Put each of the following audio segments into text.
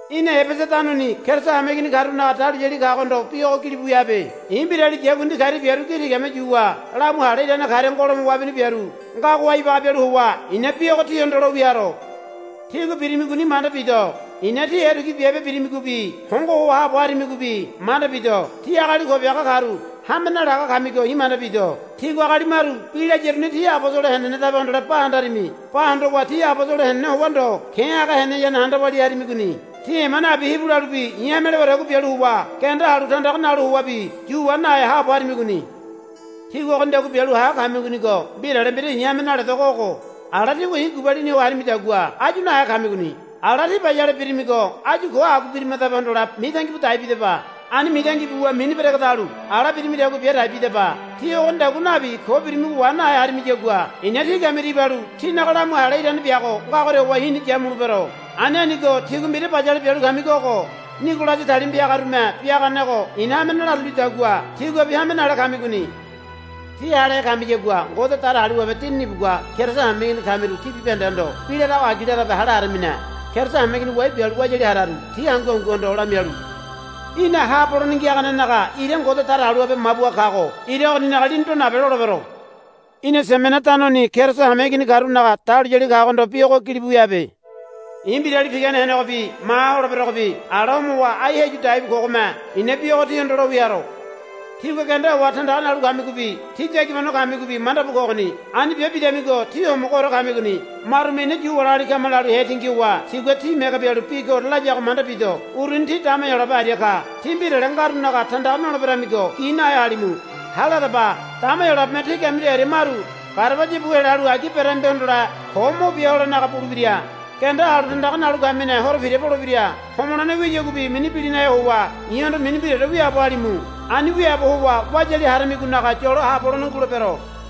Í̠na Ebesa tanoni Keriso hameigini karunaga dahuliyali kagohondo bi ogo gilibu wia habe. I̱ mbirali yakundi karia biaru gi tigame yuwa lamu hale irane karia ngolome wabini biaru ngagoha ibaga bialu howa i̱na bi ogo tíhondo lo wia haro. Tígua birimigoni manda bido. I̱na tí erekui biabe birimigobi hongo ho haabo harimigobi manda bido. Tí agali ko biaga karu hame nalaga kamigo i̱ manda bido. Tígua agali maru bi layaru ti abosolo henenedabe hondole ba handarimi. Ba hondowa ti abosolo henene howa ndo ke̱ haga heneyane handa walia harimigoni. Tí ema nabi hibu lalubi i̱ hame lewadagua bialu howa genda halu tandaga nalu howabi yu wa nahe haabo harimigoni. Tígua ogonidagua bialu ha kamigonigo mbirale mbira i̱ hame naledogo ogo. Ala tígua i̱ gubalini ho harimidagua áyu nahe kamigoni. Ala tí bayale birimigo áyu ko agua birimadabe hondole mitangi bu dai bidaba. Ani mitangi buwa mini beregedalu ala birimidagua bia dai bidaba. Tí ogonidagua nabi ko birimigo wa nahe harimiyagua i̱na tí kamiria ibalu tínaga lamu hale irane biago ngagoria howa i̱ni yamulebero. Ani anigo tígua mbira bayale bialu kamigo ogo. Nigolasi talima piagarume biaganego i̱na hame nalarulidagua tíguabi hame nale kamigoni. Tí halehe kamiyagua Ngode Datagaliwabe Dinini ibugua Keriso hameigini kamiru tí bibahendehondo bi larago agi larabe hale haramine. Keriso hameigini wai bialu wayali hararu ti hangu hanguhondo lamialu, Í̠na haabo holene ngiaganenaga ira Ngode Datagaliwabe mabuha kago ira ogoninaga lini do nabe, lolebero. Í̠na Simena tanoni Keriso hameigini karunaga dahuliyali kagohondo bi ogo gilibu wia habe. I̱ mbirali pigane henegobi maha holeberogobi ala homowa ai heyu dai bu kogome i̱na bi ogo tíhondo lo wia haro. Tígua genda howa tandaga nalu kamigobi tí yagibano kamigobi manda bu kogoni. Ani bia bidamigo tí homogoore kamigoni. Marume, Ina Yu wali agali kama, lalu hetingi howa tigua tí mege bialu bi koore layago manda bido. Uruni ti dama Heyolabe aria ka. Tí mbirale ngarunaga tandaga noleberemigo gi nahe halimu. Hale hadaba. Dama Heyolabeme tí kamiru aria maru garabaya bu helalu agi beramibe hondole ko mo bia holenaga bulebira. Genda halu tandaga nalu kamine horo pira polebira. Homolene wiyaguabi mini bilinahe howa i̱hondo mini mbiraore wiaabo halimu. Ani wiaabo howa wayali haramigonaga yolo haabo holene ngulebero.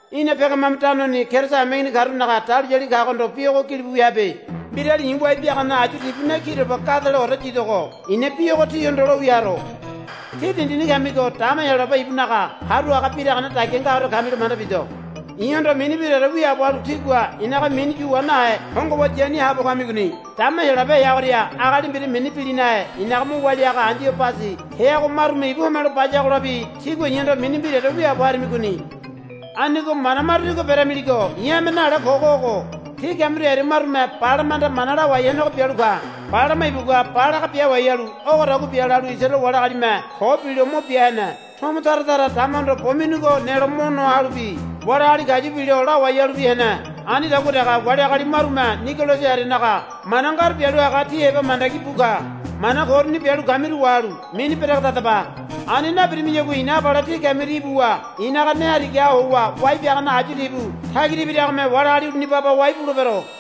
Í̠na Pegamamu tanoni Keriso hameigini karunaga dahuliyali kagohondo bi ogo gilibu wia habe. Mbirali i̱ wai biagane ayu tibu ne kiroba gadeleore yidogo i̱na bi ogo tíhondo lo wia haro. Tí dindini kamigo dama Heyolabe ibunaga haru haga biragane dagia ngagoria kamilo manda bido. I̱hondo mini mbiraore wiaabo halu tígua i̱naga mini yu wa nahe hongo howa yani haabo kamigoni. Dama Heyolabe heagoria agali mbira mini bilinahe i̱naga mo walia haga Andibasi heago marume ibu homelo bayagolabi tígua i̱hondo mini mbiraore wiaabo harimigoni. Anigo mana maru tígua beramiligo i̱ hame nale kogo ogo. Tí kamiru aria marume Balamahanda mana lawai henego bialu ka. Balama ibugua Balaga biawai halu ogodagua bia lalu Isaraele wali agalime ko bilo mo bia hene. Tomo tara tara damahondo bo minigo nelo mo noa halubi wali agali kayu bilo lawai halubi hene. Anidagua dege wali agali marume Nigolasi arianaga mana ngaru bialu haga tí heba mandagi bu ka. Mana ko uruni bialu kamiru wahalu mini beregedadaba. Ani nabirimiyagua i̱na abale tí kamiria ibuwa i̱naga ne harigaha howa wai biagane ayu tibu tagira ibiragome wali agali uruni baba wai bulebero.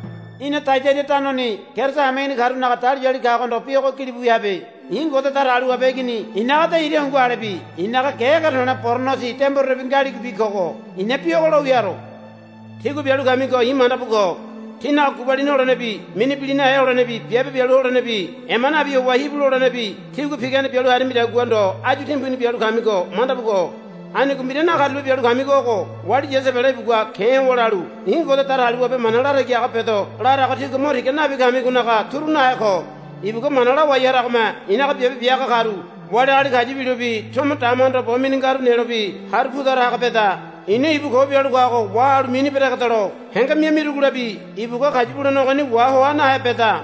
Í̠na Taiadaira tanoni Keriso hameigini karunaga dahuliyali kagohondo bi ogo gilibu wia habe. I̱ Ngode Datagaliwabe Igini i̱naga de ira hungu alebi i̱naga ge ege to̱le̱ boronosi demborerebi ngaligobi kogo i̱na bi ogo lo wia haro. Tígua bialu kamigo i̱ manda bu ko. Tínaga gubalini holenebi mini bilinahe holenebi biabe bialu holenebi ema nabi howa hibu lolenebi tígua pigane bialu harimidagua ndo áyu timbuni bialu kamigo manda bu ko. Anigo mbira nakarulape bialu kamigo ogo. Wali Yasebele ibugua ke̱ howa lalu, I̱ Ngode Datagaliwabe mana latagi haga bedo, larago tígua mo tiga nabi kamigonaga turu nahe ko. Ibugua mana lawai haragome i̱naga biabe bia haga karu wali agali kayu bilobi tomo damahondo bo mini ngaru nelobi haru pu tara haga beda. I̱na ibu ko bialu kago wahalu mini beregedelo henge mia mirugolabi ibugua kayu bulene ogoni wahoa nahe beda.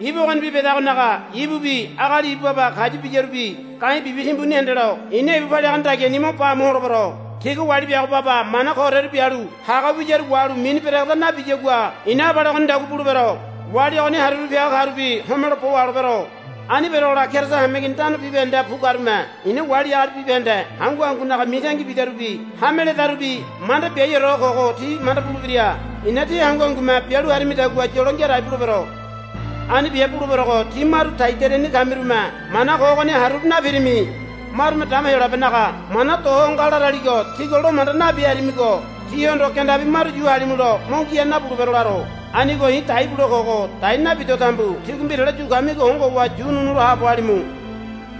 Ibu ogonibi bedagonaga ibubi agali ibu baba kayu biyarubi ga̱i̱ bibi timbuni hendelo i̱na ibu paliagane dagiani mo ba amu holebero. Tigua wali biago baba mana kooreru bialu haga wiyaru wahalu mini beregeda nabiyagua i̱na abale ogonidagua bulebero. Wali ogoni haruru piaga karubi homelo bo waholebero. Ani berogola Keriso hameigini tano bibahendeha bu karume i̱na wali agali bibahende hangu hangunaga mitangi bidarubi hame ledarubi manda biaiore ho kogo ti manda bulebira. I̱na tí hangu hangume bialu harimidagua yolo ngia dai bulebero. Ani bia buleberogo tí maru Taiadairani kamirume mana ko ogoni haruru napirimi. Marume dama Heyolabenaga mana do ho nga laraligo tígua lo manda nabi harimigo tíhondo gendabi maru yu halimulo mo ngia nabulebero laro. Anigo i̱ dai bule kogo dai nabido tambu tígua mbirale yu kamigo hongo howa yu ununu lo haabo halimu.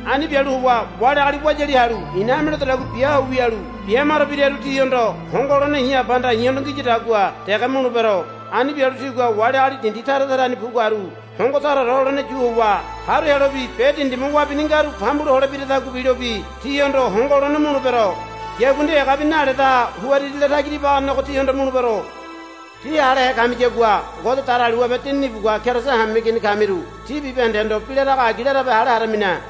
Ani bialu howa wali agali wayali halu i̱na hame ledodagua bia ho wialu bia maro biraru tihondo hongo holene i̱ Abahanda i̱hondo ngiyadagua dege mulebero. Ani bialu tigua wali agali dindi tara tarani bu karu hongo taraore holene yu howa haru helobi be dindime wabini ngaru pambulo holobiradagua bilobi tihondo hongo holene mulebero. Yakundi egabi naledaha huririle tagira ibaganego tihondo mulebero. Tí halehe kamiyagua Ngode Datagaliwabe Dinini ibugua Keriso hameigini kamiru tí bibahendehondo bi larago agi larabe hale haramine.